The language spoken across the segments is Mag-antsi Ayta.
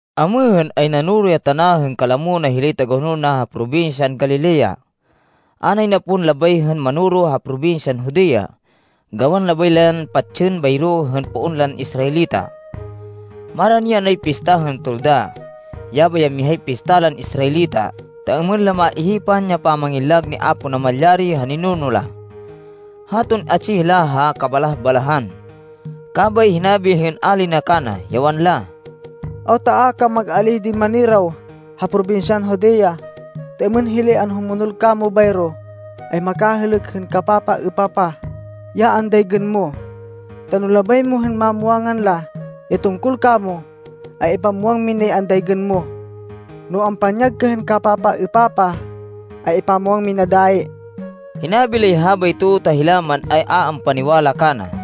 Amêhên, ay nanoro ya tana hên kalamo na hilay tagahonol na ha probinsyan Galilea. A nay na pon labay hên manoro ha probinsyan Judea, gawan labay la yan patsên bayro hên poon lan Israelita. Marani yanay Pista hên Tolda, yabay ya mihay pista lan Israelita ta êmên la maihipan ya pamangillag ni Apo Namalyari ha ninuno la, haton atsi hila ha kabalah-balahan. Kabay hinabi hên ali na kana, ya wanla, “Awta a ka mag-alíh din maniraw ha probinsyan Judea, ta êmên hilay anhumonol kamo bayro, ay makahêlêk hên kapapaêpapah, ya andaygên mo. Ta no labay mo hên mamwangan la ya tungkol kamo, ay ipamwang minay andaygên mo. No ampanyag ka hên kapapaêpapah, ay ipamwang mina dayi.” Hinabi lay habayto ta hila man, ay a ampaniwala kana.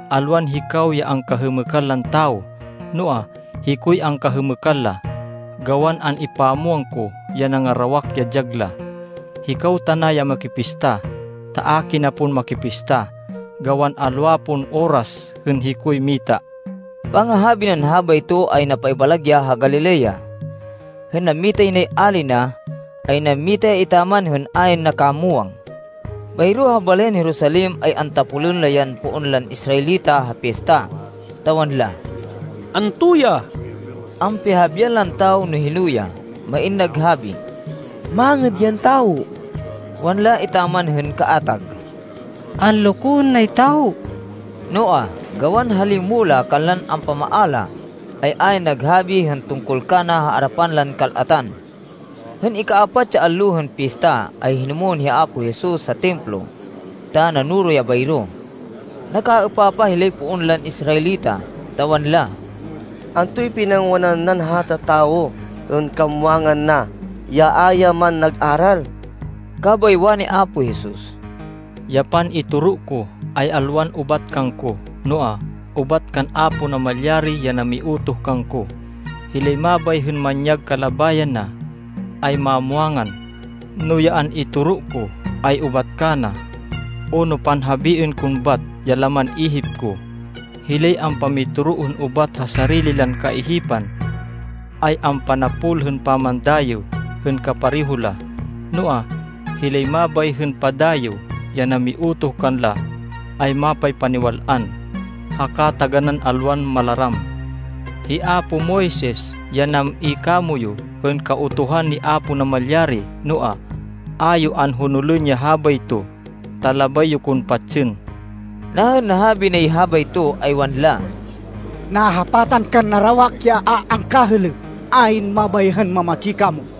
Alwan hikaw ya angkahêmêkan lan tawo, noa, hikoy angkahêmêkan la, gawan an-ipamwang ko ya nangarawak ya dyag la. Hikaw tana ya makipista, ta a kina pon makipista gawan alwa pon oras hên hikoy mita.” Pangahabi nan habayto ay napaibalag ya ha Galilea. Hên nammitay nay ali na, ay nammita ya etaman hên ayn nakamwang. Bayro ha balayan Jerusalem ay antapolên la yan poon lan Israelita ha pista, ta wanla, “Anto ya?” Ampihahabian lan tawo no hino ya. Main naghabi, “Mangêd yan tawo.” Wanla etaman hên kaatag, “Anlokoên nay tawo.” Noa, gawan ha limo la kanlan ampamaala, ay ayn naghabi hên tungkol kana ha arapan lan kal-atan. Hên ika-apat ya allo hên pista, ay hinumwên hi Apo Jesus ha Templo, ta nanoro ya bayro. Nakaêpapah hilay poon lan Israelita, ta wanla, “Antoy pinangwanan nan hata tawo, hên kamwangan na, ya a ya man nag-aral?” Kabay wani Apo Jesus, “Ya pan-itoro ko ay alwan ubat kangko, noa, ubat kan Apo Namalyari ya namiutoh kangko. Hilay mabay hên manyag kalabayan na, ay mamwangan, no ya an-itoro ko ay ubat kana, o no panhabiên kon bat ya laman ihip ko. Hilay ampamitoro hên ubat ha sarili lan kaihipan, ay ampanapol hên pamandayêw hên kapareho la. Noa, hilay mabay hên padayêw ya namiutoh kanla ay mapaypaniwal-an haka taganán alwan malaram. Hi apo Moises ya nam-i kamoyu hên Kautuhan ni Apo Namalyari. Noa, a yo anhonolên ya habayto, ta labay yo kon patsên.” Nahên nahabi nay habayto, ay wanla, “Nahapatan kan narawak ya a angkahêlêk. Ayn mabay hên mamatsi kamo!”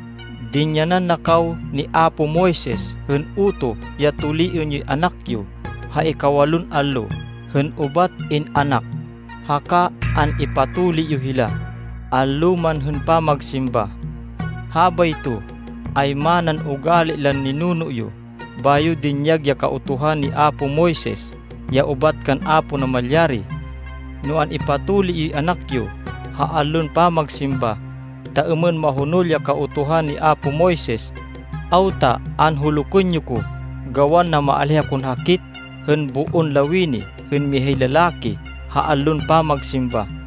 Dinyanan na kaw ni apo Moises hên utoh ya tuliên yoy anak yo ha ikawalon allo hên ubat in-anak, haka an-ipatuli yo hila, allo man hên pamagsimba. Habayto ay manan ugali lan ninuno yo bayo dinyag ya Kautuhan ni apo Moises ya ubat kan Apo Namalyari. No an-ipatuli yoy anak yo ha allon pamagsimba, ta êmên mahonol ya Kautuhan ni apo Moises, awta anhulukên yo ko gawan namaalíh akon hakit hên boon lawini hên mihay lalaki ha allon pamagsimba!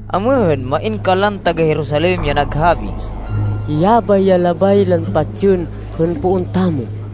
Amêhên, main kanlan taga-Jerusalem ya naghabi, “Yabay ya labay lan patsên hên poon tamo.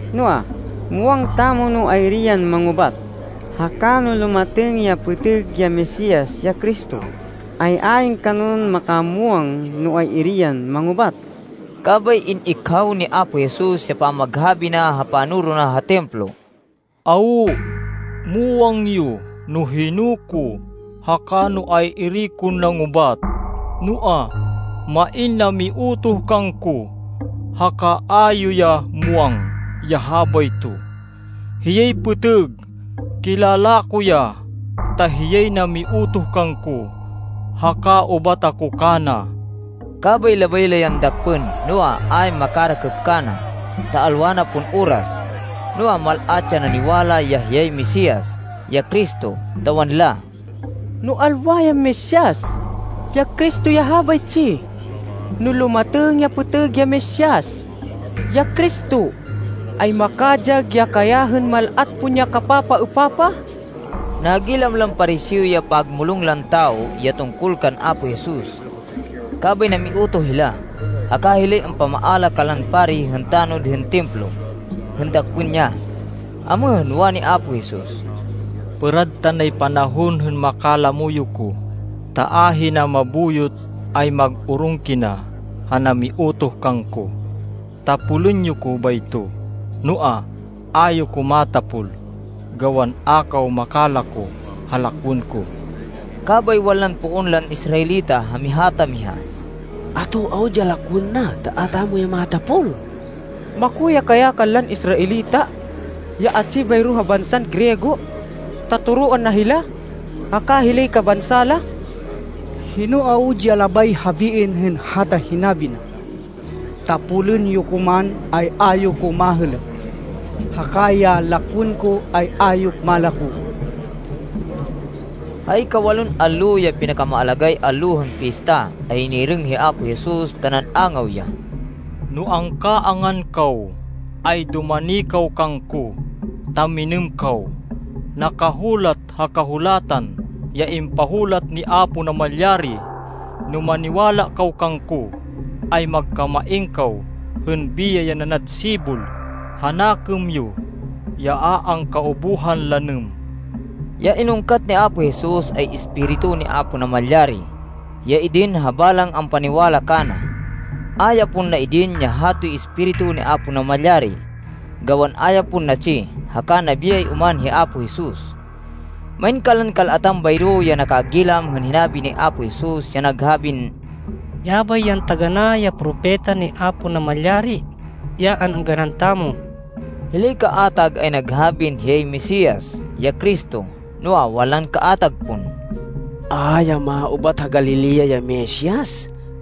Noa, muwang tamo no ay-iri yan mangubat, haka no lumatêng ya pêtêg ya Mesias, ya Cristo, ay ayn kanon makamwang no ay-iri yan mangubat.” Kabay in-ikhaw ni Apo Jesus ya pamaghabi na ha panoro na ha Templo. “Awo, muwang yo no hino ko, haka no ay-iri kon nangubat. Noa, main namiutoh kangko, haka a yo ya muwang ya habayto. Hiyay pêtêg. Kilala ko ya, ta hiyay namiutoh kangko, haka ubat ako kana.” Kabay labay la yan dakpên, noa, ayn makarakêp kana, ta alwa na pon oras. Noa, mal-at ya naniwala ya hiyay Mesias, ya Cristo, ta wanla, “No alwa yan Mesias, ya Cristo ya habaytsi, no lumatêng ya pêtêg ya Mesias, ya Cristo, ay makadyag ya kaya hên mal-at pon ya kapapaêpapah?” Nagilam lan Pariseo ya pagmulong lan tawo ya tungkol kan Apo Jesus. Kabay namiutoh hila, haka hilay ampamaala kanlan pari hên tanod hên Templo, hên dakpên ya. Amêhên, wani Apo Jesus, “Pêrad tanay panahon hên makalamo yo ko, ta ahina mabuyot ay mag-orong kina ha namiutoh kangko. Tapolên yo ko bayto. Noa, a yo ko matapol gawan a kaw makalako ha lakwên ko.” Kabay wanlan poon lan Israelita ha miha ta miha, “Ato awud ya lakwên na ta a tamo ya matapol? Mako ya kaya kanlan Israelita, ya atsi bayro ha bansan Griego, ta toroan na hila, haka hilay kabansa la?” “Hino awud ya labay habiên hên hata hinabi na, ‘Tapolên yo ko man, ay a yo ko mahêlêk,’ haka ‘Ya lakwên ko, ay a yo malako’?” Ha ikawalon allo, ya pinakamaalagáy allo hên pista, ay nirêng hi Apo Jesus, ta nan-angaw ya, “No angkaangan kaw, ay dumani kaw kangko, ta minêm kaw. Nakahulat ha Kahulatan ya impahulat ni Apo Namalyari, ‘No maniwala kaw kangko, ay magkamain kaw hên biyay ya nanad sibol ha nakêm yo ya a angkaubuhan lanêm.’” Ya inungkat ni Apo Jesus, ay Espiritu ni Apo Namalyari, ya idin ha balang ampaniwala kana. A ya pon na-idin ya hatoy Espiritu ni Apo Namalyari, gawan a ya pon natsi, haka nabiyay oman hi Apo Jesus. Main kanlan kal-atan bayro ya nakagilam hên hinabi ni Apo Jesus, ya naghabin, “Yabay yan taganá ya Propeta ni Apo Namalyari, ya an-êngganan tamo.” Hilay kaatag, ay naghabin hiyay Mesias, ya Cristo. Noa, wanlan kaatag pon, “A ya maubat ha Galilea ya Mesias.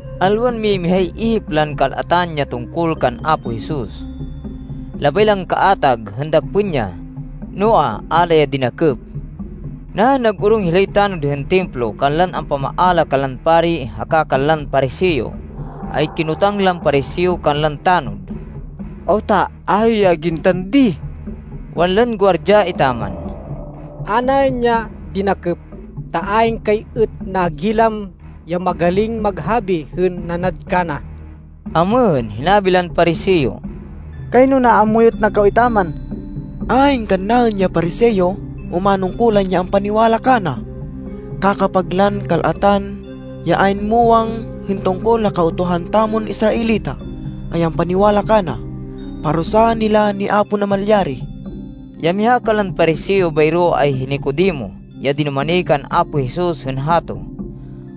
Alwan mimihay ihip lan kal-atan ya tungkol kan Apo Jesus. Labay lan kaatag, hên dakpên ya, noa, a la ya dinakêp. Nahên nag-orong hilay tanod hên Templo kanlan ampamaala kanlan pari haka kanlan Pariseo, ay kinotang lan Pariseo kanlan tanod, “Awta a yo ya gintan di?” Wanlan guardya etaman, “A naên ya dinakêp, ta ayn kay êt nagilam ya magaling maghabi hên nanad kana.” Amêhên, hinabi lan Pariseo, “Kayno naamuyot na kaw etaman. Ayn kannaên ya Pariseo o manungkulan ya ampaniwala kana. Kakapag lan kal-atan, ya ayn muwang hên tungkol ha Kautuhan tamon Israelita, ay ampaniwala kana. Parusaan hila ni Apo Namalyari.” Ya miha kanlan Pariseo bayro ay hi Nicodemo, ya dinumani kan Apo Jesus hên hato.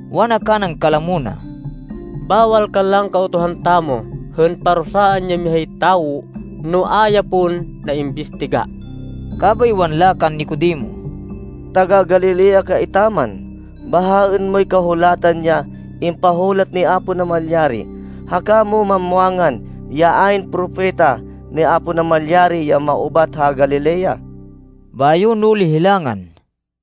Wana kanan kalamo na, “Bawal kanlan Kautuhan tamo hên parusaan ya mihay tawo, no a ya pon naimbistiga.” Kabay wanla kan Nicodemo, “Taga-Galilea ka etaman? Bahaên moy Kahulatan ya impahulat ni Apo Namalyari, haka mo mamwangan ya ayn propeta ni Apo Namalyari ya maubat ha Galilea.” Bayo nuli hilangan.